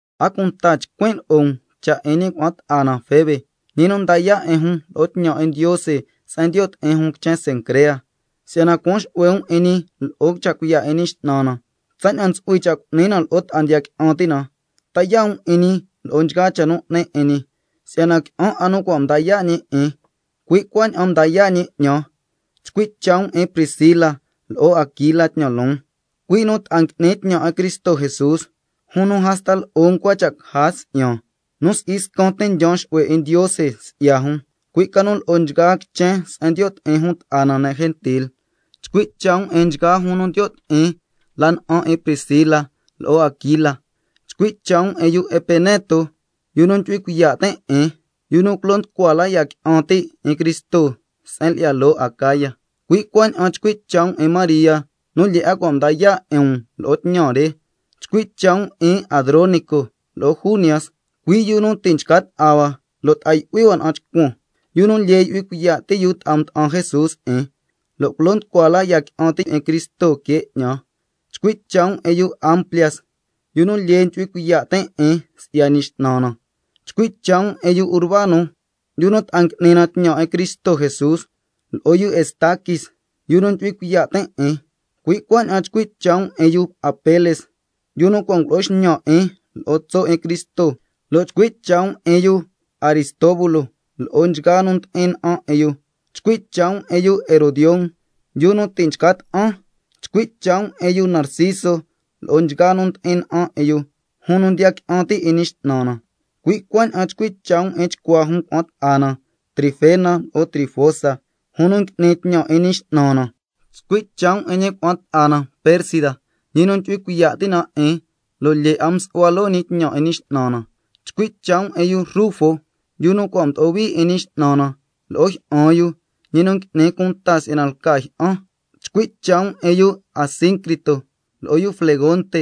A cunta chcuin' lo'o um cha' 'in ñi cuna'an ta'a na Febe, ñi nu nda yaa' 'in jun lo'o tñan 'in Ndiose se'en ndiyo' ti'in jun quichen Cencrea, si'yana cuan xu'hue um 'in ñi lo'o cha' cuiya' 'in Ñi X'nan na, tsaña'an ntsu'hui cha' cu'ni na lo'o ta'a ndiya qui'an ti' na. Ta yaa' um 'in ñi lo'o nchgaa cha' nu 'ni 'in ñi, si'yana qui'an 'a nu cua' mda yaa' ñi 'in, cui' cuaña'an mda yaa' ñi 'ñan. Chcui' cha' um 'in Priscila lo'o Aquila tñan loon, cui' nu ta'a ngui'nin tñan 'in Cristo Jesús, jun nu hasta lo'o ncua cha' caja si'yan, nu si'i scan tin ndyaan xu'hue 'in Ndiose si'ya jun, cui' ca nu lo'o nchgaa quichen se'en ndiyo' ti'in jun ta'a na ne' gentil. Chcui' cha' um 'in nchgaa jun nu ndiyo' ti'in la na'an 'in Priscila lo'o Aquila. Chcui' cha' um 'in yu Epeneto, yu nu ndyu'hui cuiya' tin' 'in, yu nu culo nducua la ya qui'an ti' 'in Cristo se'en lyi'ya loo Acaya. Cui' cuaña'an chcui' cha' um 'in María nu lyee 'a cua' mda yaa' 'in um lo'o tñan re. Chcui' cha' um 'in Adronico lo'o Junias, cui' yu nu ti' nchca ta'a hua lo' ta'a yu'hui hua na'an chcuan, yu nu lyee ndyu'hui cuiya' ti' yu ta'a mda'an Jesús 'in, lo' culo nducua la ya qui'an ti' 'in Cristo que 'ñan. Chcui' cha' um 'in yu Amplias, yu nu lyee ndyu'hui cuiya' tin' 'in si'ya Ñi X'nan na. Chcui' cha' um 'in yu Urbano, yu nu ta'a ngui'ni na tñan 'in Cristo Jesús, lo'o yu Estaquis, yu nu ndyu'hui cuiya' tin' 'in. Cui' cuaña'an chcui' cha' um 'in yu Apeles, yu nu cua' ngulo'o xñan 'in lo'o tso' 'in Cristo, lo' chcui' cha' um 'in yu Aristóbulo lo'o nchgaa nu ndi'in na'an 'in yu. Chcui' cha' um 'in yu Herodión, yu nu ti' nchca ta'an. Chcui' cha' um 'in yu Narciso lo'o nchgaa nu ndi'in na'an 'in yu, jun nu ndiya qui'an ti' 'in Ñi X'nan na. Cui' cuaña'an chcui' cha' um 'in chcua jun cuna'an ta'a na Trifena lo'o Trifosa, jun nu ngui'ni tñan 'in Ñi X'nan na. Chcui' cha' um 'in ñi cuna'an ta'a na Persida, ñi nu ndyu'hui cuiya' ti' na 'in, lo' lyee 'a msu'hua loo ñi tñan 'in Ñi X'nan na. Chcui' cha' um 'in yu Rufo, yu nu cua' mdo'o hui 'in Ñi X'nan na, lo'o jyi'an yu, ñi nu n'nin cunta si'yana lca ñi jyi'an. Chcui' cha' um 'in yu Asíncrito, lo'o yu Flegonte,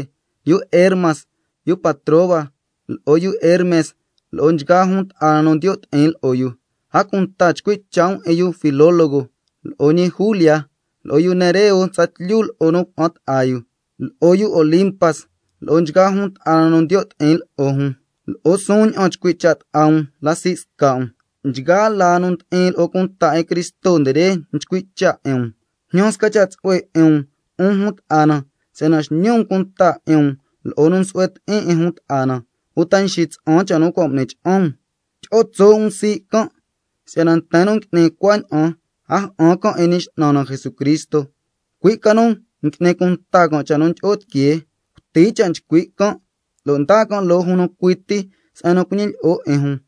yu Hermas, yu Patrobas, lo'o yu Hermes lo'o nchgaa jun ta'a na nu ndiyo' ti'in lo'o yu. A cunta chcui' cha' um 'in yu Filólogo, lo'o ñi Julia, lo'o yu Nereo tsatlyu lo'o nu cuna'an ta'a yu, lo'o yu Olimpas lo'o nchgaa jun ta'a na nu ndiyo' ti'in lo'o jun. Lo'o suun ña'an chcui' cha' ta'a um la sii' sca' um. Nchgaa laa nu ndi'in lo'o cunta 'in Cristo nde re nchcui' cha' 'in um. Jñan sca cha' tsu'hue 'in um, 'un jun ta'a na, si'yana xñi um cunta 'in um lo'o nu nsu'hue ti'in 'in jun ta'a na, uta nxitsa'an cha' nu cua' m'ni cha'an um. Tyi'o tso' um sii' can'. Si'yana nten nu ngui'ni cuaña'an a ja'an can' 'in Ñi X'nan na Jesucristo, cui' ca nu n'ni cunta can' cha' nu ndyi'o tiquee, cuti cha' nchcui' can', lo' ndaa can' loo jun nu cui ti se'en nu cuñilyi'o 'in jun.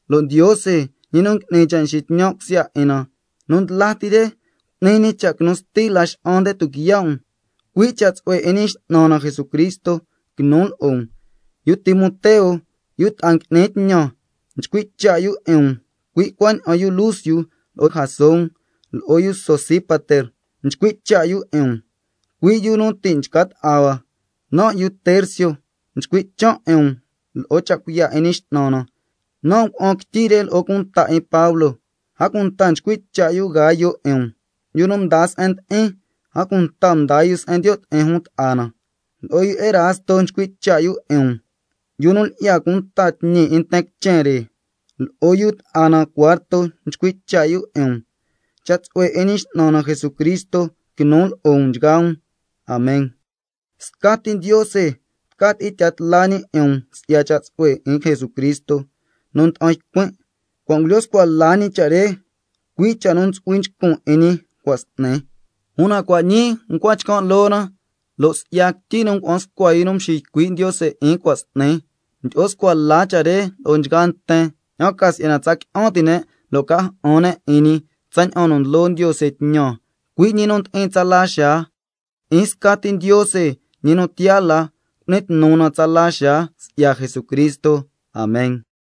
Lo' Ndiose, ñi nu n'ni cha' ndyi'in tsu'hue na, nu ndla ti re cu'ni ñi cha' quinu sti Laxa'an nde tuquiya' um. Cui' cha' tsu'hue 'in Ñi X'nan na Jesucristo quinu lo'o um. Yu Timoteo, yu ta'a ngui'nin tñan, nchcui' cha' yu 'in um, cui' cuaña'an yu Lucio, lo'o Jasón, lo'o yu Sosípater nchcui' cha' yu 'in um, cui' yu nu ti' nchca ta'a hua. Nan' yu Tercio nchcui' chan' 'in um lo'o cha' cuiya' 'in Ñi X'nan na, nan' ngua'an quityi re lo'o cunta 'in Pablo. A cunta nchcui' cha' yu Gayo 'in um, yu nu mdaa se'en ndi'in, a cunta mdaa yu se'en ndiyo' ti'in jun ta'a na. Lo'o yu Erasto nchcui' cha' yu 'in um, yu nu lyi'ya cunta tñi 'in nten quichen re, lo'o yu ta'a na Cuarto nchcui' cha' yu 'in um. Cha' tsu'hue 'in Ñi X'nan na Jesucristo quinu lo'o um nchgaa um. Amen. Scati Ndiose tca tyi'in tya tla ñi 'in um si'ya cha' tsu'hue 'in Jesucristo nu nda'an ycuin', cua' ngulyo scua la ñi cha' re, cui' cha' nu ntsu'hui nchcun 'in ñi ti' cua' s'ni, una cua' ñii ncua chcan' loo na, lo' si'ya quityi nu ngua'an scua yu nu mxiycui' Ndiose 'in cua' s'ni, mdyi'o scua la cha' re lo'o nchgaa nten, ña'an ca si'yana tsa qui'an ti' ne' lo' ca ja'an ne' 'in ñi, tsaña'an nu ndlo Ndiose tñan, cui' ñi nu ndi'in tsala xaa. 'In scati Ndiose, ñi nu tiyaa la, cu'ni tnu na tsala xaa si'ya Jesucristo. Amen.